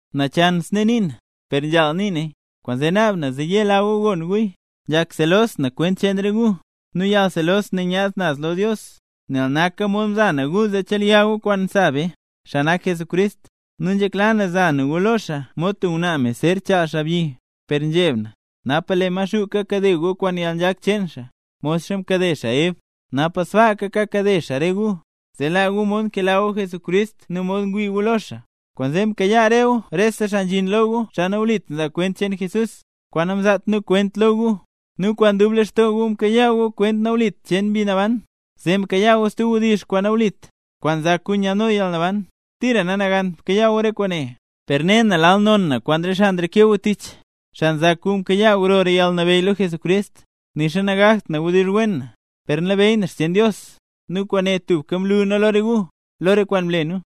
Nachan snee nii na, per nzhaal nii naya, kwaanzee naab na zee yela gu gon guya. Nzhak selos na kwent cheen re gu, nu yalselos ne nyaad naz lo Dios. Nel naka mod mza na gu zee chelya gu kwaan sa be, xaa nak Jesucrist; nu nzhekla na za na gu lo xaa mod tub ngwnaa me zer chaal xaabyi. Per nzheb na, napa lee Maxuu kakade gu kwaan yalnzhak cheen xaa, modxa mkade xaa Ev, napa sbaaka kakade xaa re gu, zee laa gu mod nkela gu Jesucrist nu mod ngwii gu lo xaa. Kwaanzee mkayaa re gu rese xaa nzhin lo gu, xaa nawlit nzaa kwent cheen Jesús, kwaan namzaat nu kwent lo gu. Nu kwaan dub lextoo gu mkayaa gu kwent nawlit cheen Mbi Naban, zee mkayaa gu stub wdizh kwaan nawlit, kwaan nzak gu nyaadno yalnaban. Tira nanagant mkayaa gu re kwaane. Per ne na lal non na kwaan re xaa nreke gu tich, xaa nzak gu mkayaa grora yalnabeyy lo Jesucrist. Nixa nagakt na wdizh wen na, per nlabeyy na xcheen Dios, nu kwaane tubka mlu nu lo re gu, lo re kwaan mle nu.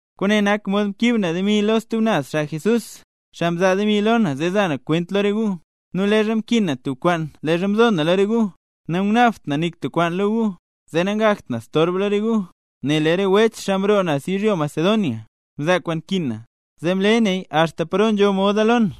Kwaane nak mod mkiib na demi lo re stub naz xaa Jesús, xaa mzaa demi lo na zee za na kwent lo re gu. Nu leezha mkin na tub kwaan leezha mzo na lo re gu, nangunaabt na nik tub kwaan lo gu, zee nangakt na storb lo re gu. Nel lee re wech, xaa mroo naz yizhyo Macedonia, mzaa kwaan nkin na. Zee mle naya axta paro nzho moda lo na,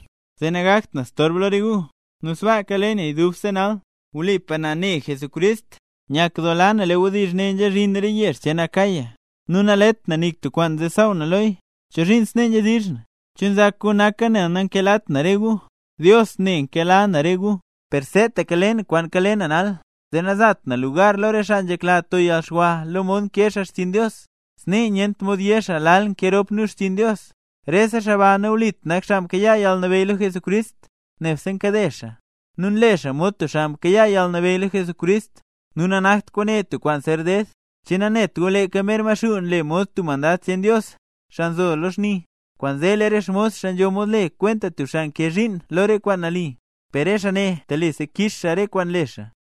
zee nangakt na storb lo re gu, nu sbaaka le naya dubse nal. Wlipa na ne Jesucrist. Nyakdoola na lee wdizh ne nzhazhin re yezh cheen Acaya, nu nalet na nik tub kwaan zee saaw na loya. ¿Chozhiin snee nzhedizh na? ¿Che nzak gu naka nel nankelat na re gu? ¡Dios ne, nkela na re gu! Per seetaka le na kwaan kale na nal, zee nazat na lugar lo re xaa nzhekla to yalxwa lo mod nkee xaa xchiin Dios. Snee nyent mod yé xaa lal nkee rop nu xchiin Dios. Rese xaa ba nawlit nak xaa mkayaa yalnabeyy lo Jesucrist, nebse nkade xaa, nu nle xaa mod tub xaa mkayaa yalnabeyy lo Jesucrist. Nu nanakt kwaane tub kwaan zer ded, che nanet gu leeka mer Maxuu nle mod tub mandad cheen Dios, xaa nzo lo xni; kwaanzee lee re xmos xaa nzho mod le kwenta tub xaa nkee zhiin lo re kwaan nali. ¡Per xaa ne telisa kix Dios re kwaan nle xaa!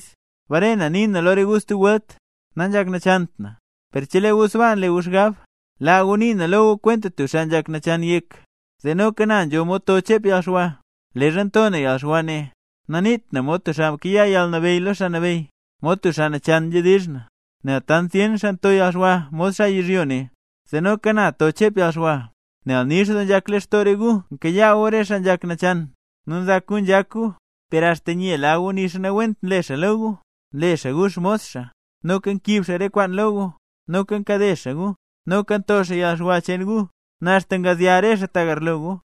Bare na nii na lo gu stub welt, nanzhak nachant na; per chelee gu sbaa nle gu xgab, laa gu nii na lo gu kwenta tub xaa nzhak nachan yek, zee noka na nzho mod to chep yalxwa. Leezha nto na yalxwa ne, naniit na mod tub xaa mkayaa yalnabeyy lo Xaa Nabeyy; mod tub xaa nachan nzhedizh na. ¡Nel tant zyen xaa nto yalxwa mod xaa yizhyo ne zee noka na to chep yalxwa! Nel nix doo nzhak lextoo re gu nkayaa gu xaa nzhak nachan. Nu nzak gu nzhak gu, per axta nyela gu nixa nawent nle xaa lo gu: nle xaa gu xmos xaa, noka nkiib xaa re kwaan lo gu, noka nkade xaa gu, noka nto xaa yalxwa cheen gu, nu axta ngazya re xaa tagarlo gu.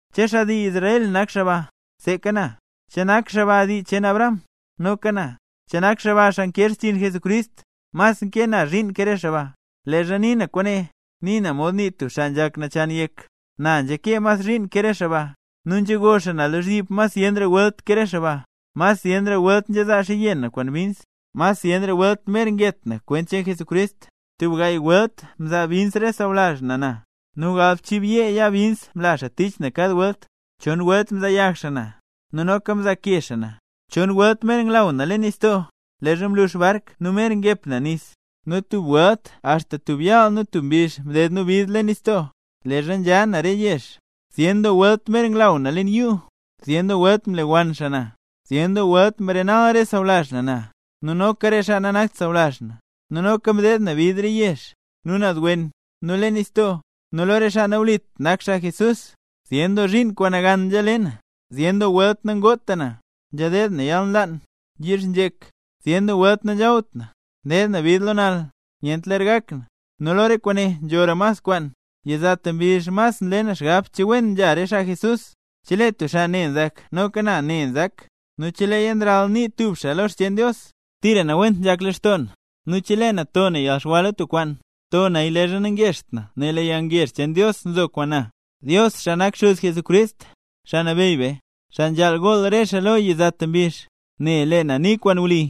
¿Che xaa dii Israel nak xaa ba? Seeka na. ¿Che nak xaa ba dii cheen Abraham? Noka na. ¿Che nak xaa ba xaa nkee xchiin Jesucrist? Na mas nkee zhiin ke re xaa ba. (Leezha nii na kwaane, nii na mod nii tub xaa nzhak nachan yek.) Na nzhakee mas zhiin ke re xaa ba, nu nzhego xaa na lozhyib mas zyenra welt ke re xaa ba, mas zyenra welt nzhezaa xaaya yenn na kwaan bins, mas zyenra welt mer nget na kwent cheen Jesucrist. Tub gaay welt mzaa bins re sawlazh na na, nu galbchiibyeega yaa bins mla xaa tich na kad welt. Chon welt mzaayag xaa na, nu noka mzaake xaa na. Chon welt mer nglaw na leen nistoo leezha mlux bark, nu mer ngep na nis, nu tub welt axta tub yaal nu tub mbizh mdeed na bid leen nistoo. Leezha nzha na re yezh: zyen doo welt mer nglaw na leen yuu, zyen doo welt mlewann xaa na, zyen doo welt mrenal re sawlazh na na, nu noka re xaa nanakt xaa sawlazh na. Nu noka mdeed na bid re yezh, nu naz wen, nu leen nistoo, nu lo re xaa nawlit nak xaa Jesús. Zyen doo zhiin kwaan nagan nzhale na, zyen doo welt nangota na, nzhadeed na yalnlaan, yizhnzhek, zyen doo welt nanzhawt na, ndeed na bid lo nal, nyent ler gak na. Nu lo re kwaane nzhora mas kwaan, yizata mbizh mas nle na xgab che wen nzha re xaa Jesús. Chelee tub xaa ne nzak, noka na ne nzak; nu cheleeya nralnii tub xaa lo xcheen Dios, tira nawent nzhak lextoo na. Nu chelee na to na yalxwa lo tub kwaan, to naya leezha nangezht na nel lee yalngezh cheen Dios nzo kwaan na. Dios, xaa nak Xuz Jesucrist, Xaa Nabeyy be, xaa nzhaal gool re xaa lo yizata mbizh, ne xaa lee na nii kwaan wli.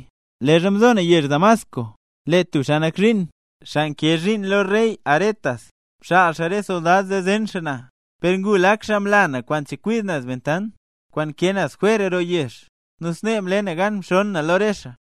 Leezha mzo na yezh Damasco, lee tub xaa nak zhiin, xaa nkee zhiin lo rey Aretas, mxaal xaa re soldad zee zen xaa na, per ngu lak xaa mla na kwaan chekwid naz bentant, kwaan nkee naz jwer roo yezh, nu snee mle na gan mxoon na lo re xaa.